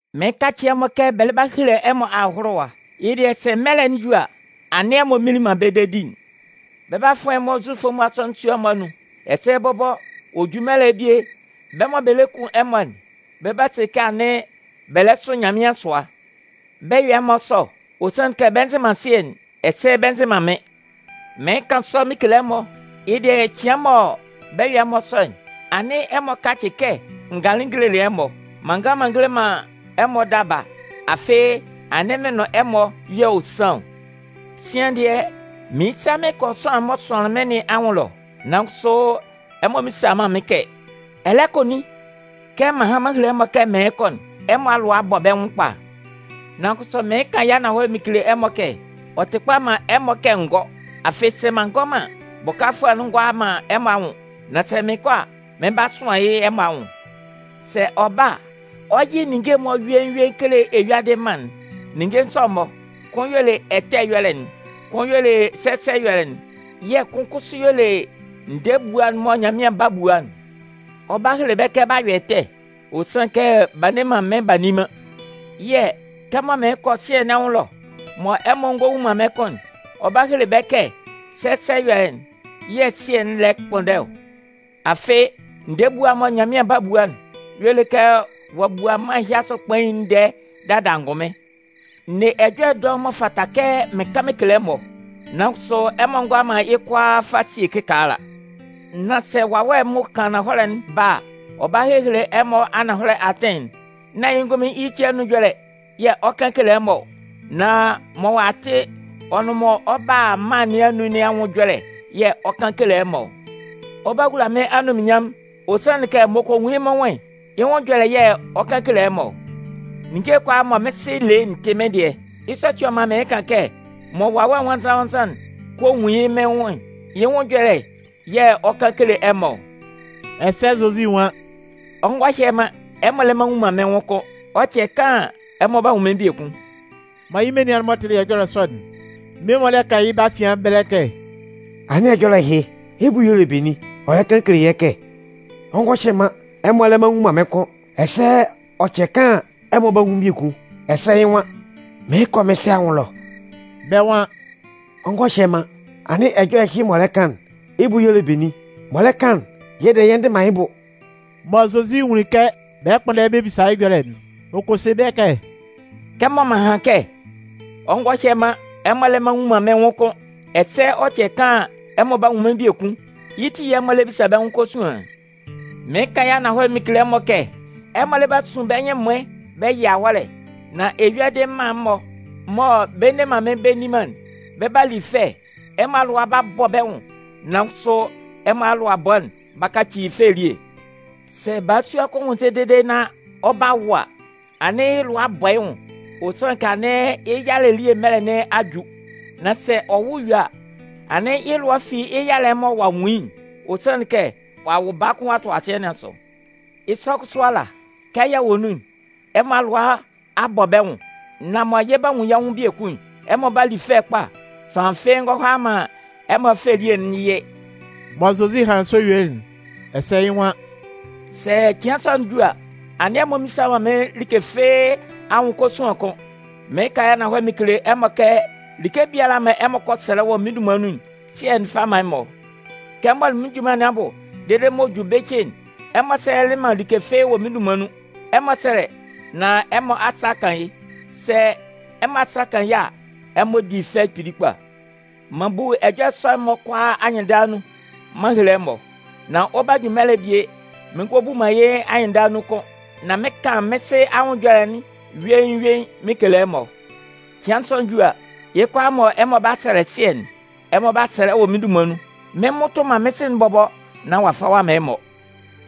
“Mɩɩn kacɩ ɛmɔ kɛ bɛ lɛ 'ba hele ɛmɔ ahʋlʋwa, yɩ́ dɩɛ sɛ mɛlɛ'n ju sʋ a, anɩn ɛmɔ mminlin man bɛ́ dedi'n. Bɛ 'ba fʋan ɛmɔ Zufʋ'n-mɔ asɔnɩn sua'n-mɔ anun. Ɛsɛ bɔbɔ, ɔ 'ba ju mɛlɛ'n bie, bɛ́ mɔ bɛ lɛ kun ɛmɔ'n 'ba se kɛ anɩn bɛ lɛ sʋ Nyanmɩan sʋa. Bɛ 'yɔ ɛmɔ sɔ, ɔ sanlɩn kɛ bɛ nzɩ man Sɩɛ'n, ɛsɛ bɛ nzɩ man mɩ́n. Nan mɩɩn kan sɔ mɩn kele ɛmɔ, yɩ́ dɩɛ cɩan mɔ bɛ 'yɔ ɛmɔ sɔ'n, anɩn ɛmɔ kacɩ kɛ n ganlɩn n gelelɩ ɛmɔ. M'an ngan m'an ngele man ɛmɔ daba, afɩ anɩn mɩn nʋn ɛmɔ y'ɔ san ɔ. “Sian dɩɛ, mɩɩn sa mɩn kɔ sʋanlan'n m'ɔ sʋanlɩn mɩ́n nɩn anwʋn ɛlɔ, nan kʋsʋ ɛmɔ mmisa man mɩ́n kɛ: ‘Ɛ lɛ kɔ nin?’ Kɛmɔ m'an han m'an hele ɛmɔ kɛ mɩɩn kɔ'n, ɛmɔ alʋa a bɔ bɛ́ nwʋn kpa. Nan kʋsʋ mɩɩn kan yɩ́ ananhɔlɛ mɩn kele ɛmɔ kɛ ɔ tɩ kpa man ɛmɔ kɛ n gɔ́. Afɩ sɛ m'an ngɔ man an, Bʋkafʋɛ'n ngɔ a man ɛmɔ anwʋn. Nan sɛ mɩn kɔ a, mɩn 'ba sʋan yɩ́ ɛmɔ anwʋn. Sɛ ɔ ba a, ɔ 'yɩ ninnge'n-mɔ yuein yuein kele eyuadɩ amma'n. Ninnge sɔ'n-mɔ, kʋn y'ɔ le ɛtɛ ɛyɔlɛ'n, kʋn y'ɔ le sɛsɛ ɛyɔlɛ'n, yɛ̂ kʋn kʋsʋ y'ɔ le ndɛɛ ebua'n mɔ Nyanmɩan 'ba bu'n. Ɔ 'ba hele bɛ́ kɛ b'a yɔ ɛtɛ, ɔ sanlɩn kɛ b'a nne man mɩ́n b'a nni man. Yɛ̂, kɛmɔ mɩɩn kɔ Sɩɛ nɩn anwʋn ɛlɔ mɔ ɛmɔ ngɔ nwun man mɩ́n kʋ́n'n, ɔ 'ba hele bɛ́ kɛ sɛsɛ ɛyɔlɛ yɛ̂ Sɩɛ'n lɛ kpʋnndɛ ɔ. Afɩ, ndɛɛ ebua'n mɔ Nyanmɩan 'ba bua'n y'ɔ le kɛ ɔ'a bua mân ɛhɩ asʋ kpain'n ndɛɛ dada angʋnmɩn. “N ne ɛjɔlɛ dɔʋn m'ɔ fata kɛ mɩn kan mɩn kele ɛmɔ, nan kʋsʋ ɛmɔ ngʋala man yɩ́ kʋalaa fa sie kɩkaala. Nan sɛ Wawɛ'n m'ɔ kan ananhɔlɛ'n ba a, ɔ 'ba hele ɛmɔ ananhɔlɛ atɩn'n. Nán yɩ́ ngʋnmɩn yɩ́ ti anun ɛjɔlɛ yɛ̂ ɔ 'kan kele ɛmɔ ɔ, nan mɔ ɔ'a tɩ ɔ nʋn mɔ ɔ 'ba a mân nɩn anun nɩn anwʋn ɛjɔlɛ yɛ̂ ɔ 'kan kele ɛmɔ ɔ. Ɔ 'ba wula mɩ́n anunminnyanmʋn, ɔ sanlɩn kɛ m'ɔ kɔ nwun yɩ́ mɩ́n nwʋn'n, yɩ́ nwʋn ɛjɔlɛ yɛ̂ ɔ 'kan kele ɛmɔ ɔ. Ninnge kʋalaa mɔ mɩ́n Sɩ le'n tɩ mɩ́n dɩɛ. Yɩ́ sɔ ati yɛ̂ ɔ man mɩɩn kan kɛ mɔ Wawɛ Nwannzan-nwannzan'n kɔ nwun yɩ́ mɩ́n nwʋn'n, yɩ́ nwʋn ɛjɔlɛ yɛ̂ ɔ 'kan kele ɛmɔ ɔ.” Ɛsɛ Zozi nwan: “Ɔ ngɔ hyɛ man, ɛmɔ lɛ mma nnwun man mɩ́n kʋ́n, ɔ cɛ kaan an, ɛmɔ 'ba nwun mɩ́n biekun.” Mɔ yɩ́ menian'n-mɔ tɩlɩ ɛjɔlɛ sɔ'n, mmie-mɔ lɛ kan yɩ́ bɛ́ afian ɛbɛlɛ kɛ: “Anɩn ɛjɔlɛ ɛhɩ, yɩ́ bʋ y'ɔ le benin? Ɔ lɛ kan kele yɛ́ kɛ: ‘Ɔ ngɔ hyɛ man, ɛmɔ lɛ mma nnwun man mɩ́n kʋ́n, ɛsɛ ɔ cɛ kaan an, ɛmɔ 'ba nwun mɩ́n biekun,’ ɛsɛ yɩ́ nwan: ‘Mɩɩn kɔ mɩ́n Sɩ anwʋn ɛlɔ.’” Bɛ́ nwan: “‘Ɔ ngɔ hyɛ man,’ anɩn ɛjɔlɛ ɛhɩ m'ɔ lɛ kan'n, yɩ́ bʋ y'ɔ le benin? M'ɔ lɛ kan'n, yɛ́ dɩɛ yɛ ndɩ man yɩ́ bʋ.” Mɔ Zozi nwunlin kɛ bɛ lɛ kpʋnndɛ bɛ bisa yɩ́ ɛjɔlɛ'n, ɔ kɔ se bɛ́ kɛ: “Kɛmɔ m'an han kɛ: ‘Ɔ ngɔ hyɛ man ɛmɔ lɛ mma nnwun man mɩ́n kʋ́n, ɛsɛ ɔ cɛ kaan an, ɛmɔ 'ba nwun mɩ́n biekun,’ yɩ́ ti yɛ̂ ɛmɔ lɛ bisa bɛ́ nwʋn kosuan'n? Mɩɩn kan yɩ́ ananhɔlɛ mɩn kele ɛmɔ kɛ ɛmɔ lɛ 'ba sun bɛ́ nyɩn ɛmʋɩn bɛ yɩ awɔ́lɛ. Nan eyuadɩ amma'n-mɔ mɔ bɛ nne man mɩ́n bɛ nni man'n, bɛ 'ba li fɛ. Ɛmɔ alʋa 'ba bɔ bɛ́ nwʋn, nan kʋsʋ ɛmɔ alʋabɔ'n 'ba kaci fɛ elie. Sɛ balasua kʋn nwʋnnzɛ dede nán ɔ 'ba wʋ a, anɩn yɩ́ lʋa a bɔ yɩ́ nwʋn. Ɔ sanlɩn kɛ anɩn yɩ́ yalɛ elie mɛlɛ nɩn a ju. Nan sɛ ɔ wʋ yue a, anɩn yɩ́ lʋa a fi yɩ́ yalɛ'n mɔ ɔ'a nwun yɩ́'n. Ɔ sanlɩn kɛ ɔ'a wʋ baa kʋn ɔ'a tʋ asɩɛ nɩn asʋ. Yɩ́ sɔ kʋsʋ ala, kɛ yɛ wɔ nun'n, ɛmɔ alʋa a bɔ bɛ́ nwʋn, nan mɔ yɛ 'ba nwun yɛ́ nwʋn biekun'n, ɛmɔ 'ba li fɛ kpa, sʋanlan fɩ́ɩ́ ngɔ hʋala man ɛmɔ fɛ elie'n yɩ.” Mɔ Zozi hanlɩn sɔ yuelɩ'n ɛsɛ yɩ́ nwan: “Sɛ cɩan sɔ'n ju a, anɩn ɛmɔ mmisa man mɩ́n like fɩ́ɩ́ anwʋn kosuan kʋ́n. Mɩɩn kan yɩ́ ananhɔlɛ mɩn kele ɛmɔ kɛ like biala mɔ ɛmɔ kɔ sɛlɛ wɔ mɩ́n dunman nun'n, Sɩɛ'n 'fa man ɛmɔ. Kɛ m mɔlɩ mɩ́n junman nɩn abʋ dede mɔ ɔ'a ju bɩcɩ'n, ɛmɔ sɛlɛlɩ man like fɩ́ɩ́ wɔ mɩ́n dunman nun. Ɛmɔ sɛ́lɛ, nán ɛmɔ asa 'kan yɩ́. Sɛ ɛmɔ asa kan yɩ́ a, ɛmɔ 'di fɛ kpili kpa. “M'an bu ɛjɔlɛ sɔ'n-mɔ kʋalaa anyɩnndala nun, m'an hele ɛmɔ. Nan ɔ 'ba ju mɛlɛ'n bie, mɩn ngɔ mmu man yɩ́ anyɩnndala nun kʋ́n, nan mɩn 'kan mɩ́n Sɩ anwʋn ɛjɔlɛ'n yuein yuein mɩn kele ɛmɔ. Cɩan sɔ'n ju a, yɩ́ kʋalaa mɔ ɛmɔ 'ba sɛlɛ Sɩɛ'n, ɛmɔ 'ba sɛlɛ wɔ mɩ́n dunman nun. Mɩn mmʋtʋ man mɩ́n Sɩ'n bɔbɔ nán ɔ'a fa ɔ'a man ɛmɔ.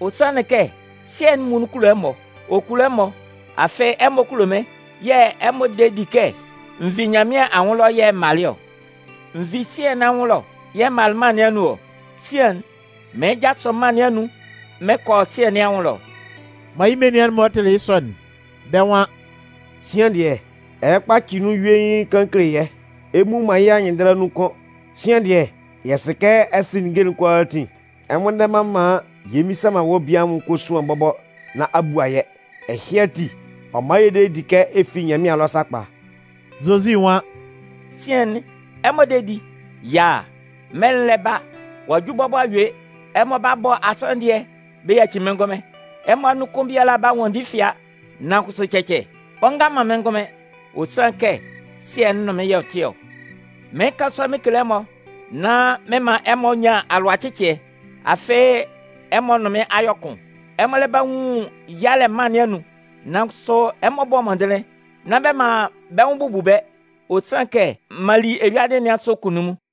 Ɔ sanlɩn kɛ, Sɩɛ'n muonun kulo ɛmɔ. Ɔ kulo ɛmɔ, afɩ ɛmɔ kulo mɩ́n, yɛ̂ ɛmɔ de di kɛ n vi Nyanmɩan anwʋn ɛlɔ yɛ̂ m malɩ ɔ. N vi Sɩɛ nɩn anwʋn ɛlɔ yɛ̂ m malɩ mân nɩn anun ɔ. Sian'n mɩɩn jasʋ mân nɩn anun mɩn kɔ Sɩɛ nɩn anwʋn ɛlɔ.” Mɔ yɩ́ menian'n-mɔ tɩlɩ yɩ́ sɔ'n, bɛ́ nwan: “Sian dɩɛ, ɛ lɛ kpacɩ nun yuein kan kele yɛ́, ɛ mmu man yɩ́ anyɩnndala nun kʋ́n. Sian dɩɛ, yɛ sɩ kɛ ɛ sɩ ninnge'n kʋalaatin, ɛ nnwʋnndɛ man maan yɛ mmisa man wɔ́ bie anwʋn kosuan bɔbɔ nán a bua yɛ́. Ɛhɩ ati, ɔ man yɛ de yɛ di kɛ ɛ fi Nyanmɩan ɛlɔ sakpa.” Zozi nwan: “Sian'n ɛmɔ de di? Yaa! Mɛlɛ'n lɛ ba, ɔ'a ju bɔbɔ a yue, ɛmɔ 'ba bɔ asanndɩɛ bɛ yaci mɩ́n ngʋnmɩn, ɛmɔ anun kʋn biala 'ba nwanndi fɩa. Nan kʋsʋ cɛcɛ, ɔ nga man mɩ́n ngʋnmɩn, ɔ sanlɩn kɛ Sɩɛ'n nʋn mɩ́n y'ɔ tɩ ɔ. “Mɩɩn kan sɔ mɩn kele ɛmɔ, nán mɩn man ɛmɔ nyan alʋacɩcɩɛ, afɩ ɛmɔ nʋn mɩ́n a yɔ kʋn. Ɛmɔ lɛ 'ba nwun yalɛ mân nɩn anun, nan kʋsʋ ɛmɔ bɔ́ mɔndɩnlɩn, nán bɛ man bɛ́ nwʋn bubu bɛ́, ɔ sanlɩn kɛ m'an li eyuadɩ nɩn asʋ kunnunmun.”